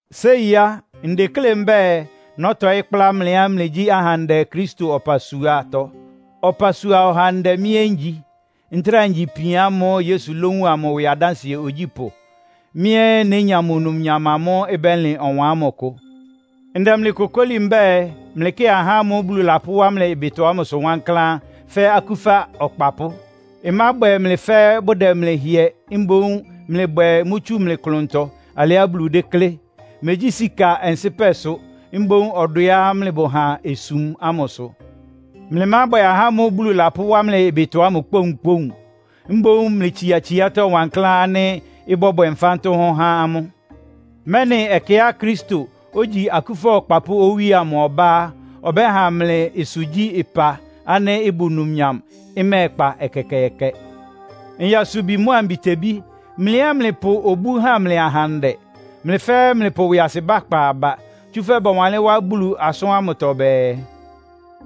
Séi á, ndeklé mbɛ́ɛ, nɔ́tɔɩ́ kplá mlɩá mlɩgyí ahandɛ Kristo ɔpasuatɔ. Ɔpasua ɔhandɛ mɩ́ ɛ́ ngyi. Ntráa ngyi ipian ámʋ́ʋ́ Yesu lówun amʋ ɩwɩ adánsɩɛ ogyípʋ́. Mɩ́ ɛ́ nénya mʋ numnyam amʋ́ʋ́ ɩbɛ́lɩn ɔwan ámʋ ɩkʋ. Ndɛ mlɩ kokóli mbɛ́ɛ, mlɩkɩ ahá ámʋ́ʋ́ Bulu lapʋ́wá mlɩ ɩbɩtɔ amʋsʋ wankláán fɛ́ akúfa ɔkpapʋ́. Ɩmábwɛ mlɩ fɛ́ bʋdɛ mlɩ hɩɛ, mboún mlɩbwɛ mʋ́ tsu mlɩ klʋntɔ alɩá Bulu déklé. Megyí sika ɔnsɩ́pɛ sʋ, mboún ɔdwɛá mlɩbʋ ha osum ámʋ sʋ. Mlɩmábwɛ ahá ámʋ́ʋ́ Bulu lapʋ́wá mlɩ ɩbɩtɔ ámʋ kpóunkpóun. Mboún mlɩtsia tsiátɔ́ wankláán ánɩ́ ɩbɔ́bwɛ nfántʋ́hʋ́n há amʋ́, mɛ́nɩ ɛkɛá Kristo, ogyi akúfa akpapʋ́ Owíe amʋ ɔbá á, ɔbɛ́ha mlɩ ɩsʋgyí-ɩpa ánɩ́ ɩbʋ numnyam, ɩmɛ́ɛkpa ɛkɛkɛɛkɛ. Nyasubi mʋ́a mbitebí, mlɩ ɛ́ mlɩpʋ obú há mlɩ ahandɛ. Mlɩ fɛ́ɛ́ mlɩpʋ ɩwɩasɩbá kpa aba. Tsúfɛ́ bɔwanlɩ́n wá Bulu asʋ́n ámʋtɔ bɛɛ,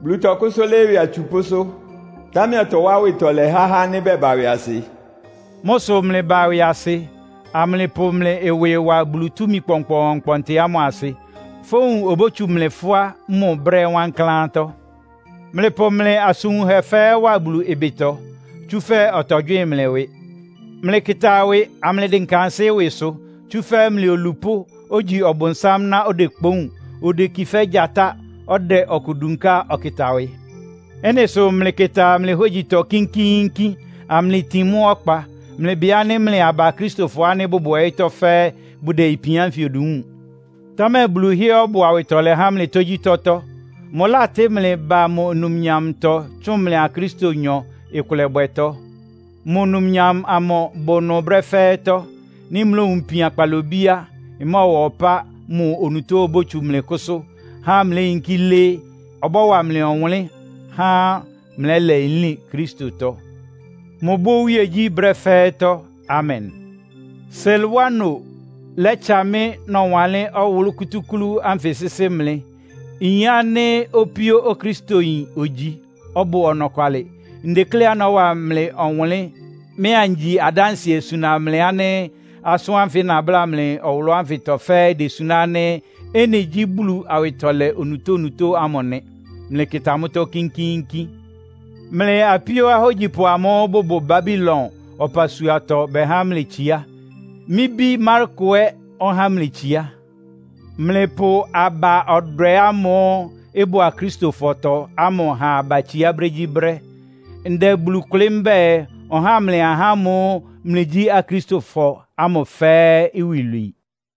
“Bulu tɔkʋ́sʋ́ lɩ́ɩ́ ɩwɩ atsupʋ́sʋ́, támɛ ɔtɔwá awɩtɔlɛ há ahá ánɩ́ bɛba ɩwɩasɩ.” Mʋ́ sʋ mlɩba ɩwɩasɩ, amlɩpʋ mlɩ ɩwɩ wa Bulu túmi kpɔnkpɔɔnkpɔntɩ ámʋ asɩ, fówun obótsu mlɩ fʋ́á mʋ brɛ́ wankláántɔ́. Mlɩpʋ mlɩ asʋn wunhɛ fɛ́ɛ́ wa Bulu ɩbɩtɔ, tsúfɛ́ ɔtɔgywɩ́ɩn mlɩ ɩwɩ. Mlɩkɩta ɩwɩ, amlɩdɩnka ansɩ́ ɩwɩsʋ, tsúfɛ́ mlɩ olupʋ́, ogyi Ɔbʋnsám ná odekpoún, odeki fɛ́ gyatá, ɔdɛ ɔkʋ dunká ɔkɩta wɩ. Ɩ́nɩ sʋ mlɩkɩta mlɩ hógyitɔ kínkíínkín, amlɩtin mʋ ɔkpa. Mlɩbɩ ánɩ́ mlɩ aba Akristofɔ ánɩ́ bʋbʋ ɔyɩ́tɔ́ fɛ́ɛ́ bʋdɛ ipian ánfɩ odu wúun. Támɛ Bulu hɩ́ɛ́ ɔbʋ awɩtɔlɛ há mlɩ tógyítɔ́tɔ́. Mʋlátɩ́ mlɩ ba mʋ numnyamtɔ tsʋn mlɩa Kristonyɔ ɩkʋlɛbwɛtɔ́. Mʋ numnyam amʋ bʋ ɩnʋ brɛ́ fɛ́ɛ́tɔ́. Nɩ́ mlowun ipian kpalobí á, ɩmɔ́ɔwa ɔpá mʋ onutó obótsu mlɩ kʋ́sʋ́, há mléyinkí lɩ́ɩ́. Ɔbɔ́wa mlɩ ɔwʋnlɩ́n, há mlɛ́lɛ nlín Kristotɔ. Mʋbʋ́ iwíegyí brɛ́ fɛ́ɛ́tɔ́. Amen! Silwano lɛ́tsa mɩ́ nɔwanlɩ́n ɔwʋlʋ́ kútúklú ánfɩ sɩ́sɩ́ mlɩ. Nyin ánɩ́ opíó Okristoyin ogyi, ɔbʋ ɔnɔkwalɩ. Ndekléá nɔ́wa mlɩ ɔwʋnlɩ́n, mɩ́ angyi adánsɩɛ suna mlɩ ánɩ́ asʋ́n ánfɩ nabláa mlɩ ɔwʋlʋ́ ánfɩtɔ fɛ́ɛ́ idesuná ánɩ́ ɩ́nɩ gyí Bulu awɩtɔlɛ onutónutó ámʋ nɩ. Mlɩkɩta mʋ́tɔ́ kínkíínkín. Mlɩ apíó ahógyipʋ amʋ́ʋ́ bʋbʋ Babilon ɔpasuatɔ bɛhá mlɩ itsiá. Mɩ́ bí Marko ɛ́ ɔhá mlɩ itsiá. Mlɩpʋ aba-ɔdwɛ ámʋ́ʋ́ ɩbʋ Akristofɔtɔ ámʋ ha aba itsiá brégyíbrɛ́. Ndɛ Bulu kʋlɩ́ mbɛ́ɛ, ɔháa mlɩ ahá ámʋ́ʋ́ mlɩgyí Akristofɔ ámʋ fɛ́ɛ́ iwilwii.